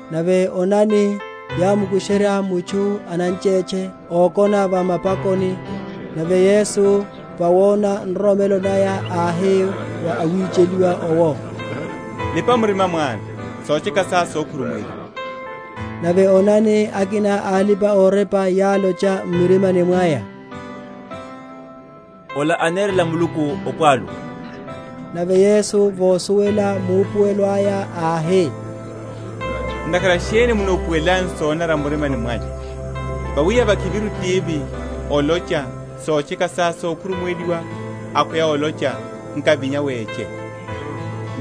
Nave onani, yám’mukusherya mutchu ananchétche, okona va mapakoni: nave Yesu vawona nroromelo naya, áhi wa awicheliwa owo, Lipa murima, mwana, sotcheka sá sokhurumuweliwa. Nave onani, akina a alipa‐orepa yálocha m’murimani mwaya, Ola anerela Muluku opwalu. Nave Yesu, vosuwela maupuwelo aya, áhi, Ntakhara sheni munupuwelelanyu sonanara m’mirimani mwanyu? vawi yavakhiviru tivi, olocha, Sotcheka sá sokhurumuweliwa; akhweya olocha, Nkavinya, weche?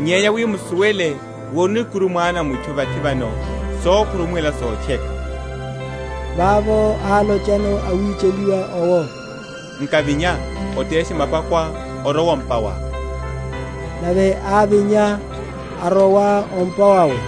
Nyenya wi musuwele wi orino ikuru Mwana a mutchu vathi vano sokhurumuwela sotcheka (vavo álochano awicheliwa owo), Nkavinya, oteshe mapakoá, orowe o’mpa wá. Nave ávinya, arowa o’mpa wawe.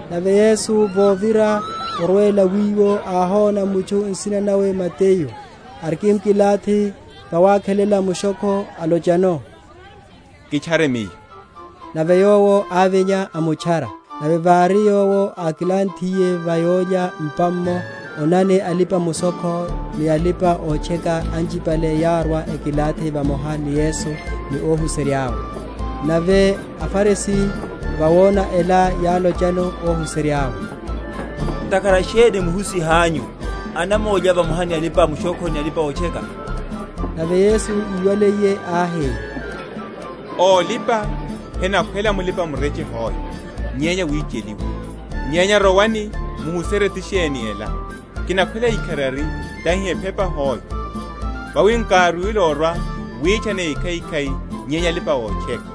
Nave Yesu vovira, orwela wiwo, áhona mutchu, nsina nawe Mateyu, arikimkilathi vawakhelela mushokho, alochano, Kitchare Miyo. Nave yowo ávinya, amutchara. Nave vári Yowo ákilanthiye va yólya m’pa’mmo, onani, alipa‐mushokho ni alipa‐otcheka anchipale yárwa ekilathi vamoha ni Yesu ni óhuserya’we. Nave aFarisi, vawona ela, yálochano óhuserya’we, Ntakhara sheni Muhusihanyu anamólya vamoha ni alipa‐mushokho ni alipa‐otcheka? Nave Yesu íwaliye áhi, Ólipa henakhwela mulipa‐mureche hoe, nyenya awicheliwa. Nyenya rowani muhuserye ti sheni ela, Kinakhwela ikharari, tahi ephepa hoe: vawi nkárwile orwa witchana ékhaikhai nyenya alipa‐otcheka. Oinanela olya.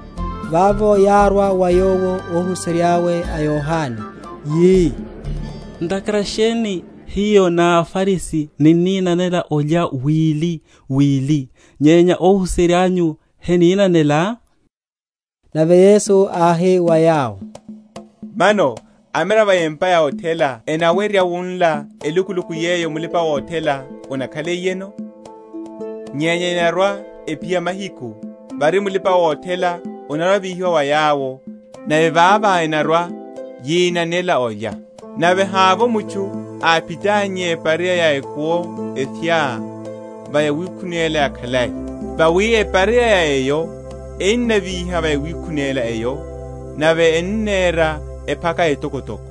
Vavo yárwa wa Yowo óhuserya’we a Yohane, yi, Ntakhara sheni hiyo ni aFarisi ninninanela olya wili wili, nyenya óhuserya’nyu heninanela? Nave Yesu áhi wa yawo, Mano amiravo a empa ya othela enawerya wunla elukuluku yeyo mulipa‐othela anakhaliyeno? nyenya enarwa‐ephiya mahiku, vári mulipa‐othela anarwa‐avíhiwa wa yawo, nave vavo enarwa‐yinanela olya. Nave hávovo mutchu áphitannye epareya ya ekuwo ephya va yawikhunela yakhalai; vawi epareya’ya eyo enavíha wa yawikhunela eyo, nave ennera ephaka etokotoko.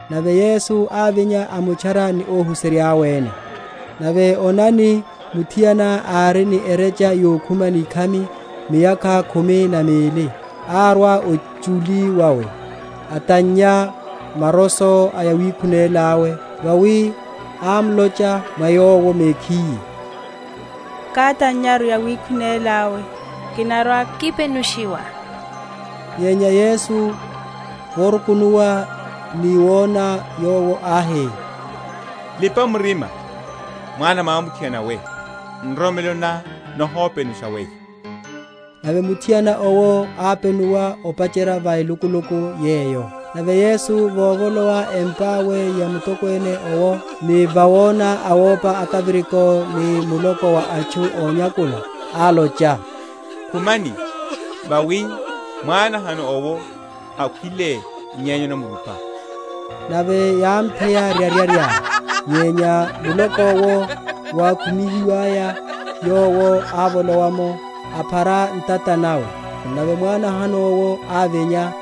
Nave Yesu ávinya amutchara, ni óhuserya’we ene. Nave onani, muthiana ári ni ereche yokhuma nikhami miyakha khumi na mili, árwa ochuli wawe, atannya maroso a yawikhunela awe: vawi ámlocha mwa yowo mekhiye, Katannyaru yawikhunela yawe kinarwa‐kipenushiwa. Nyenya Yesu vorukunuwa ni wona yowo áhi, Lipa murima, mwana mwamuthiana we, nroromelo ná nihopenusha weyo. Nave muthiana owo ápenuwa opacherya va elukuluku yeyo. Nave Yesu vovolowa empa awe ya mutokwene owo, ni vawona awópa akaviriko ni muloko wa atchu ónyakula, álocha, Khumani, vawi mwánahano’wo hakhwile nyenya anamrupa. Nave yámtheya ryaryarya. Nyenya muloko’wo wákumihiwaya, Yowo ávolowa’mo, aphara ntata nawe; nave mwánahano’wo ávinya.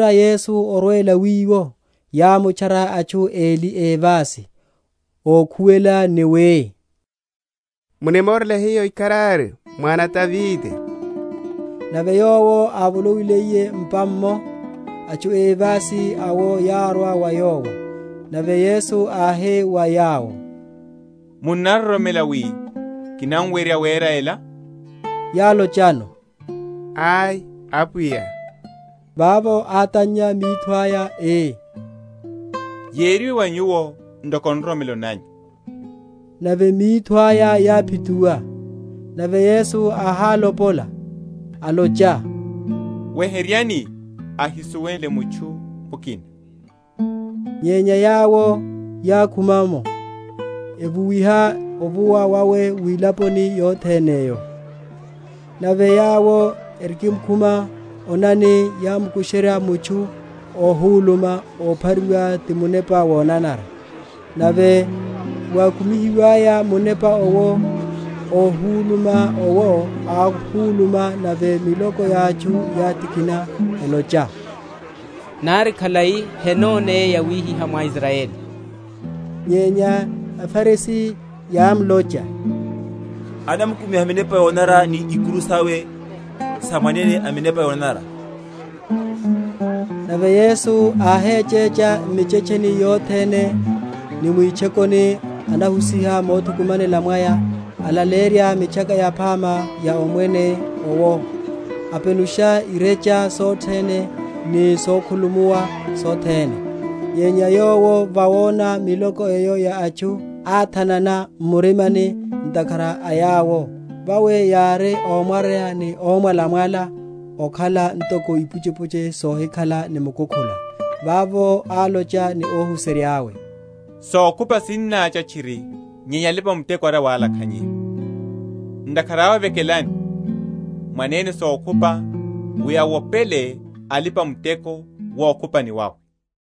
Nave vovira Yesu orwela wiwo, yámutchara atchu eli évasi, ókhuwela ni wi, Munimorele hiyo ikharari, mwana a Davide. Nave Yowo ávolowiliye m’pa’mmo, atchu évasi awo yárwa wa Yowo: nave Yesu áhi wa yawo, Munnaroromela wi kinawerya wera ela? Yálochano, Ai, Apwiya. Vavo átannya mitho aya, ii, Yériwe wa nyuwo ntoko nroromelo nanyu. Nave mitho aya yáphituwa. Nave Yesu áhálopola, alocha, Weheryani, ahisuwele mutchu mukina. Nyenya yawo yákhuma’mo, evuwiha ovuwa wawe mwilaponi yothene’yo. Nave yawo erikimkhuma, onani, yámkusherya mutchu óhuluma, óphariwa ti munepa wonanara. Nave wákumihiwaya munepa owo, óhuluma owo áhuluma, nave miloko ya atchu yátikhina, elocha, Nari khalai henoneye yawihihá mwa Israyeli. Nyenya aFarisi yámlocha, anamkumiha minepa yonanara ni ikuru sawe sa mwene a minepa yonanara. Okhupa ni alipa‐muteko. Nave Yesu áhechecha m’michetcheni yothene ni mwitchokoni anahusiha mothukumanela mwaya, alaleyerya Mitchaka Yaphama ya Omwene owo, apenusha irecha sothene ni sokhulumuwa sothene. Nyenya Yowo, vawona miloko eyo ya atchu, áthanana m’murimani ntakhara a yawo, vawi yári ómwaryeya ni ómwalamwala ókhala ntoko ipuchepuche sohikhala ni mukukhula. Vavo álocha ni óhuserya’we, Sokhupa sinnácha tchiri nyenya alipa‐muteko ari awalakhanyeya. Ntakhara awe vekelani Mwanene sokhupa, wi awopele alipa‐muteko wukhupani wawe.